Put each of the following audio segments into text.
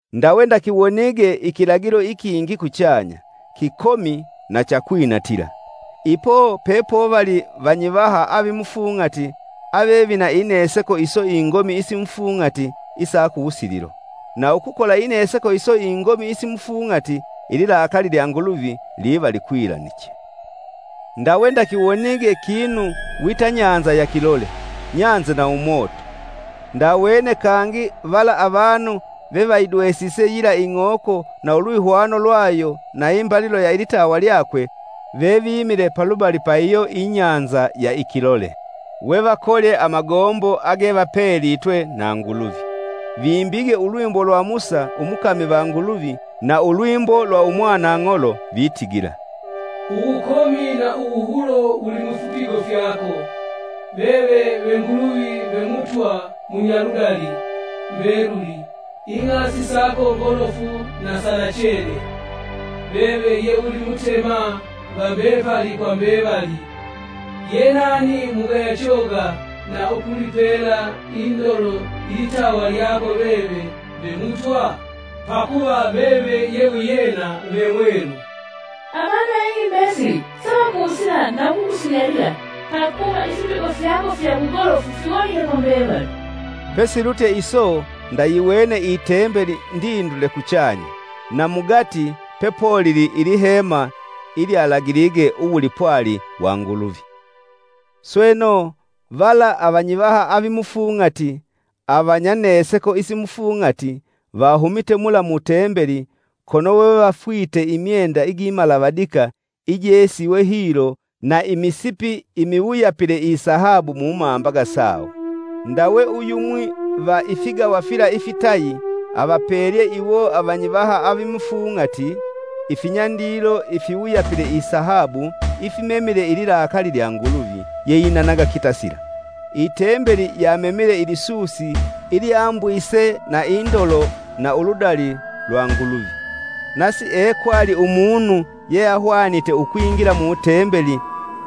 Ndawe ndakiwonige ikilagilo ikingi kuchanya, kikomi na cha kwinatila. Ipo pepovali vanyivaha avimufung'ati ave vina ineseko iso ingomi isimufung'ati isa kuwusililo. Na ukukola ineseko iso ingomi isimufung'ati, ililakali lya Nguluvi liva likwilaniche. Ndawe ndakiwonige kinu wita bahali ya kilole, nyanze na umoto. Ndawene kangi vala avanu vevayidwesise yila ing'oko na ulwihwano lwayo na imbalilo ya ilitawa lyakwe, vevimile palubali pa iyo ibahali ya ikilole, wevakolye amagombo agevapelitwe na Nguluvi. Vimbige ulwimbo lwa Musa umukami va Nguluvi na ulwimbo lwa Umwanang'olo vitigila: “Uwukomi wa uwuhulo wulimufipigo fyako! Veve ve Nguluvi ve Mutwa munyaludali mbeluli ing'asi sako ngolofu na sanachena! Veve ye ulimutema va mbepali kwa mbevali. Ye nani mugaya choga na ukulipela indolo ilitawa lyako veve ve Mutwa? Pakuva veve ye wiyena ve mwelu. Avanu va ing'i mbesili savakusila na ukukusunyalila pakuva ifipigo fyako fya wugolofu fiwonike kwa mbevali.” Pesilutye iso ndayiwene i Tembeli ndindule kuchanya, na mugati pepolili ilihema ilyalagilige uwulipwali wa Nguluvi. sweno, vala avanyivaha avimufung'ati avanya neseko isimufung'ati vahumite mula mu Tembeli, kono wevafwite imyenda igimalavadika ijesiwe hilo na imisipi imiwuyapile isahabu mumambaga sawo. Ndawe, uyumwi va ifigawa fila ifitayi avapelye iwo avanyivaha avimufung'ati ifinyandilo ifiwuyapile isahabu ifimemile ililakali lya Nguluvi, yeinanaga kitasila. Itembeli yamemile ilisusi ilyambwise na indolo na uludali lwa Nguluvi, na siekwali umunu yeahwanite ukwingila mu Tembeli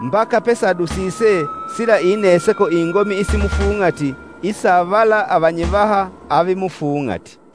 mbaka pesadusise sila ineseko ingomi isimufung'ati isa vala avanyivaha avimufung'ati.